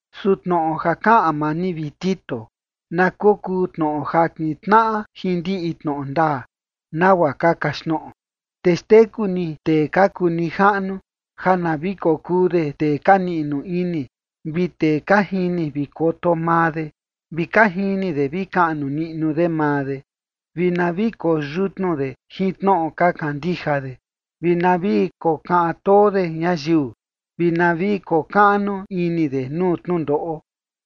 Su tnoꞌo ja kaꞌan maa ni, vi Tito, na kokuu tnoꞌo ja kintnaꞌa jin ndiꞌi tnoꞌo ndaa, nagua ka kaxtnoꞌo. Te xteku ni tee ka kuu nijaꞌnu ja na vi kokuu de tee ka niꞌnu ini, vi tee ka jini vi koto maa de, vi ka jini de vi kaꞌnu niꞌnu de maa de, vi na vi koyutnu de jin tnoꞌo ka kandija de, vi na vi kokaꞌan too de ñayiu, vi na vi kokaꞌnu ini de nuu tnundoꞌo.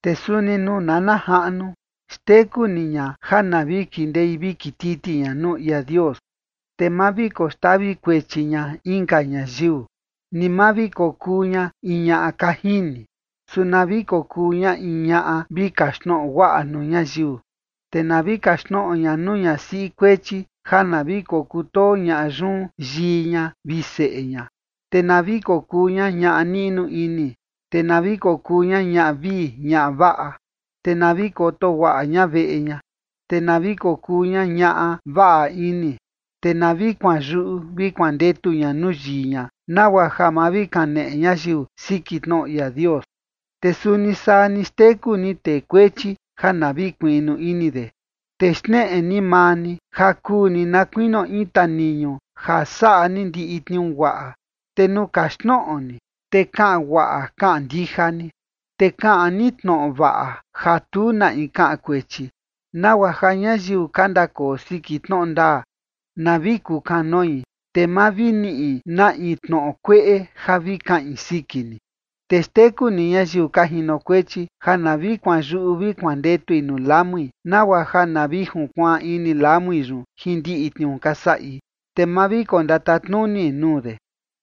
Te suni nuu nana jaꞌnu, xteku ni ña ja na vi kindei vi kititi ña nuu ia Dios, te ma vi koxtavi kuechi ña inka ñayiu, ni ma vi kokuu ña in ñaꞌa ka jini, su na vi kokuu ña in ñaꞌa vi kaxtnoꞌo guaꞌa nuu ñayiu. Te na vi kaxtnoꞌo ña nuu ñasiꞌi kuechi ja na vi kokutoo ñaꞌa yun yii ña vi seꞌe ña, te na vi kokuu ña ñaꞌa niꞌnu ini, te na vi kokuu ña ñaꞌa vii ñaꞌa vaꞌa, te na vi koto guaꞌa ña veꞌe ña, te na vi kokuu ña ñaꞌa vaꞌa ini, te na vi kuanyuꞌu vi kuandetu ña nuu yii ña nagua ja ma vi kaneꞌe ñayiu siki tnoꞌo ia Dios. Te suni saa ni xteku ni tee kuechi ja na vi kuiꞌnu ini de. Te xneꞌe ni maa ni ja kuu ni na kuinio in taniñu ja saꞌa ni ndiꞌi tniuu guaꞌa. Te nuu kaxtnoꞌo ni, te kaꞌan guaꞌa kaꞌan ndija ni. Te kaꞌan ni tnoꞌo vaꞌa ja tu na in kaꞌan kuechi, nagua ja ñayiu ka ndakoo siki tnoꞌo ndaa na vi kukanoi, te ma vi niꞌi na in tnoꞌo kueꞌe ja vi kaꞌin siki ni. Te xteku ni ñayiu ka jinokuechi ja na vi kuanyuꞌu vi kuandetui nuu lamui, nagua ja na vi junkuaan ini lamui yun jin ndiꞌi tniuu ka saꞌi, te ma vi kondatatnuni nuu de.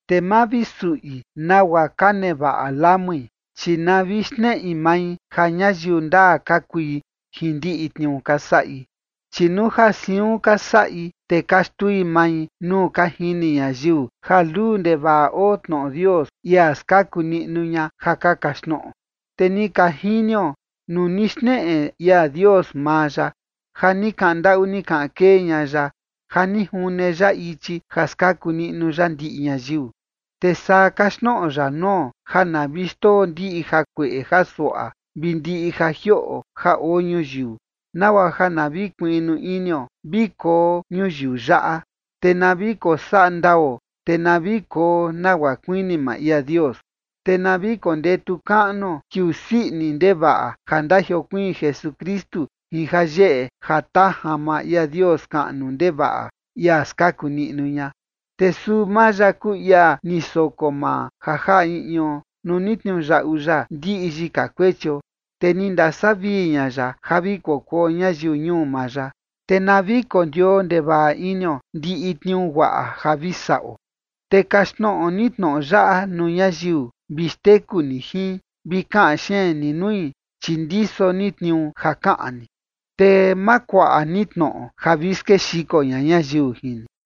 Te ma vi suꞌi nagua ka nevaꞌa lamui, chi na vi xneꞌi mai ja ñayiu ndaa ka kui jin ndiꞌi tniuu ka saꞌi, chi nuu ja siun ka saꞌi, te ka xtui mai nuu ka jini ñayiu ja luu ndevaꞌa oo tnoꞌo Dios, ia skaku niꞌnu ña ja ka kaxtnoꞌo. Te ni ka jinio, nuu ni xneꞌe ia Dios maa ya, ja ni kaꞌan ndaꞌu ni kaꞌan kee ña ya ja ni june ya ichi ja skaku niꞌnu ya ndiꞌi ñayiu. Te saa kaxtnoꞌo ya nuo ja na vi xndoo ndiꞌi jakueꞌe jasuaꞌa vi ndiꞌi ja jioꞌo ja oo ñuyiu, nagua ja na vi kuiꞌnu inio vi koo ñuyiu yaꞌa, te na vi kosaꞌa ndao, te na vi koo nagua kuini maa ia Dios. Te na vi kondetu kaꞌnuo kiuu sii ini ndevaꞌa ja ndajiokuiin Jesukristu jin jayeꞌe jatajan maa ia Dios kaꞌnu ndevaꞌa, ia skaku niꞌnu ña. Te suu maa ya kuu ia ni soko maa ja jaꞌa in ion, nuu ni tniuyaꞌu ya ndiꞌi yika kuechio, te ni ndasavii ña ya ja vi kokuo ñayiu ñuu maa ya, te na vi kondioo ndevaꞌa inio ndiꞌi tniuu guaꞌa ja vi saꞌo. Te kaxtnoꞌo ni tnoꞌo yaꞌa nuu ñayiu, vi xteku ni jin, vi kaꞌan xeen ni nui, chi ndiso ni tniuu ja kaꞌan ni. Te ma kuaꞌa ni tnoꞌo ja vi skexiko ña ñayiu jin ni.